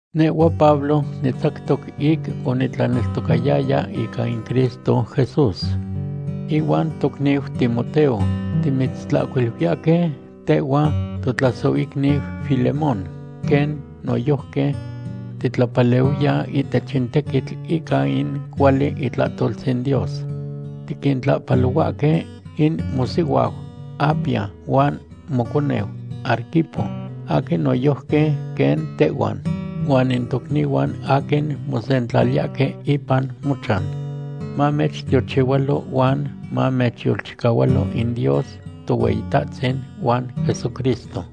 Nehhua Pablo nitzactoc ic onitlanonotzayaya ica in Cristo Jesús. Ihuan tocniu Timoteo timitztlahcuiluiyahque tehhua totlasohicniu Filemón, quen noyojqui titlapalehuiya ihtech in tequitl ica in cuali itlahtoltzin Dios. Tiquintlahpalohuahque in mosihuau Apia huan moconeu Arquipo aquin noyojqui quen tehhuan, huan in tocnihuan aquin mosentlaliyahque ipan mochan. Mamechtiochihualo huan mamechyolchicahualo in Dios Tohueyitahtzin huan Jesucristo.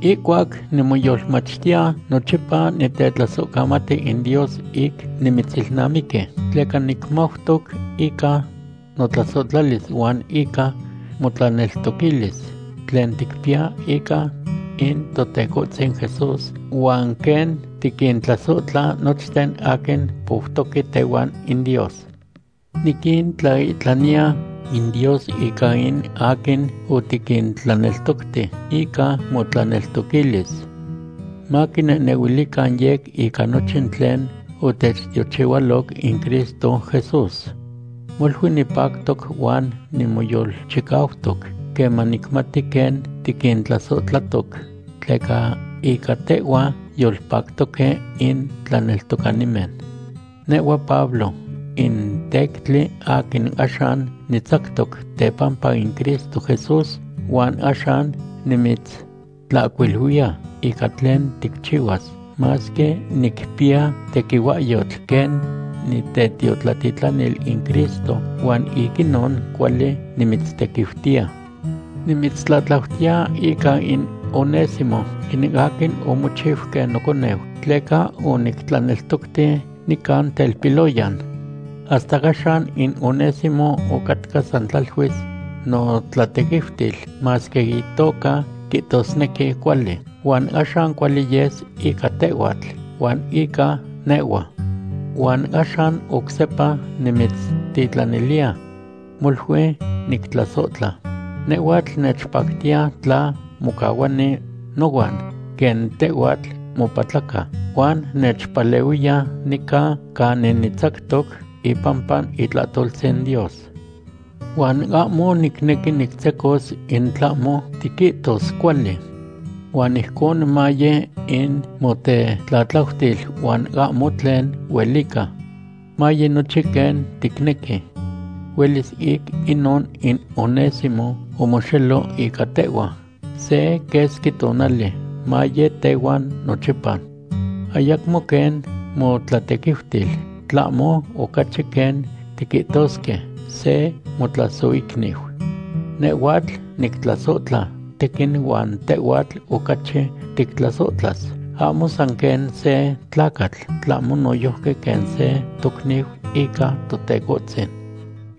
Ihcuac nimoyolmachtiya, nochipa nitetlasohcamati in Dios ic nimitzilnamiqui. Tleca nicmautoc ica motlasohtlalis huan ica motlaneltoquilis tlen ticpiya ica in Totecohtzin Jesús huan quen tiquintlasohtla nochten aquin poutoque tehuan in Dios. Niquintlaihtlaniya in Dios ica in aquin otiquintlaneltocti ica motlaneltoquilis. Maquinehnehuilican yec ica nochin tlen otechtiochihualoc in Cristo Jesús. Molui nipactoc huan nimoyolchicautoc queman nicmati quen tiquintlasohtlatoc, tleca ica tehhua yolpactoque in tlaneltocanimen. Nehhua Pablo in tectli aquin axan nitzactoc tepampa in Cristo Jesús, huan axan nimitztlatlautiya ica tlen ticchihuas, masque nicpiya tequihuahyotl quen nitetiotlatitlanil in Cristo huan ic inon cuali nimitztequiutiya. Nimitztlatlautiya ica in Onésimo, in aquin omochiu quen noconeu, tleca onictlaneltocti nican telpiloyan. Hasta axan inon Onésimo ocatca san tlaluis motlatequiutil, masque itoca quihtosnequi cuali. Huan axan cuali yes ica tehhuatl huan ica nehhua. Huan axan oc sepa nimitztitlaniliya. Molui nictlasohtla. Nehhuatl nechpactiya tla mocahuani nohuan quen tehhuatl mopatlaca huan nechpalehuini nica canin nitzactoc ipampa itlahtoltzin Dios. Huan ahmo nicnequi nictzecos in tlahmo tiquihtos cuali. Huan ijcon maye in motetlatlautil huan ahmo tlen huelica. Maye nochin quen ticnequi. Huelis ic inon in Onésimo omoxelo ica tehhua se quesqui tonali, maye tehuan nochipa. Ayacmo quen motlatequiutil, tlahmo ocachi quen tiquihtosque, se motlasohicniu. Nehhuatl nictlasohtla tequin huan tehhuatl ocachi tictlasohtlas, ahmo san quen se tlacatl, tlahmo noyojqui quen se tocniu ica Totecohtzin.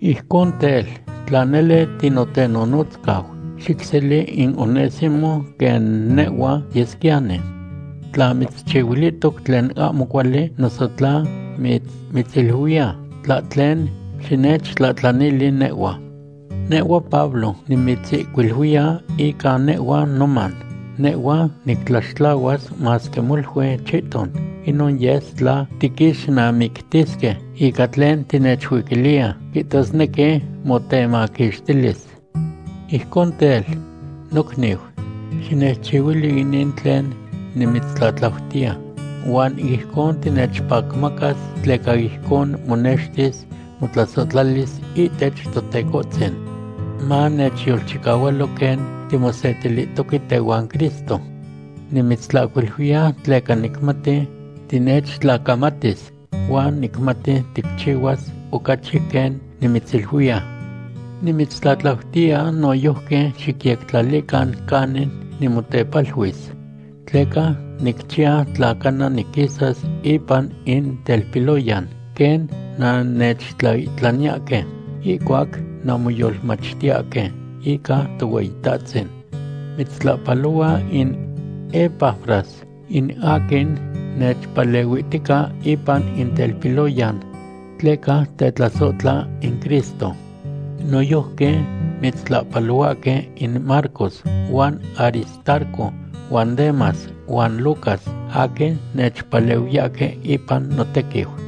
Ijcon tel, tla nele tinotenonotzcau, xicseli in Onésimo quen nehhua yesquiyani. Tla mitzchihuilihtoc tlen ahmo cuali, noso tla mitzuiquiliya tlahtlen, xinechtlahtlanili nehhua. Nehhua Pablo, nimitzihcuiluiya ica nehhua noman, nehhua nictlaxtlahuas, masque molui chihton inon yes tla tiquixnamictisque ica tlen tinechuiquiliya, quihtosnequi motemaquixtilis. Ijcon tel, nocniu, xinechchihuili inin tlen nimitztlatlautiya, huan ijcon tinechpacmacas tleca ijcon monextis motlasohtlalis ihtech Totecohtzin. Manechyolchicahualo quen timosetilihtoque tehuan Cristo. Nimitztlahcuiluiya tleca nicmati tinechtlacamatis, huan nicmati ticchihuas ocachi quen nimitziluiya. Nimitztlatlautiya noyojqui xicyectlalican canin nimotepaluis, tleca nicchiya tla cana niquisas ipan in telpiloyan quen nannechtlaihtlaniyahque ihcuac nanmoyolmachtiyahque ica Tohueyitahtzin. Mitztlahpalohua in Epafras, in aquin nechpalehuihtica ipan in telpiloyan, tleca tetlasohtla in Cristo. Noyojqui mitztlahpalohuahque in Marcos huan Aristarco huan Demas huan Lucas aquin nechpalehuiyahque ipan notequiu.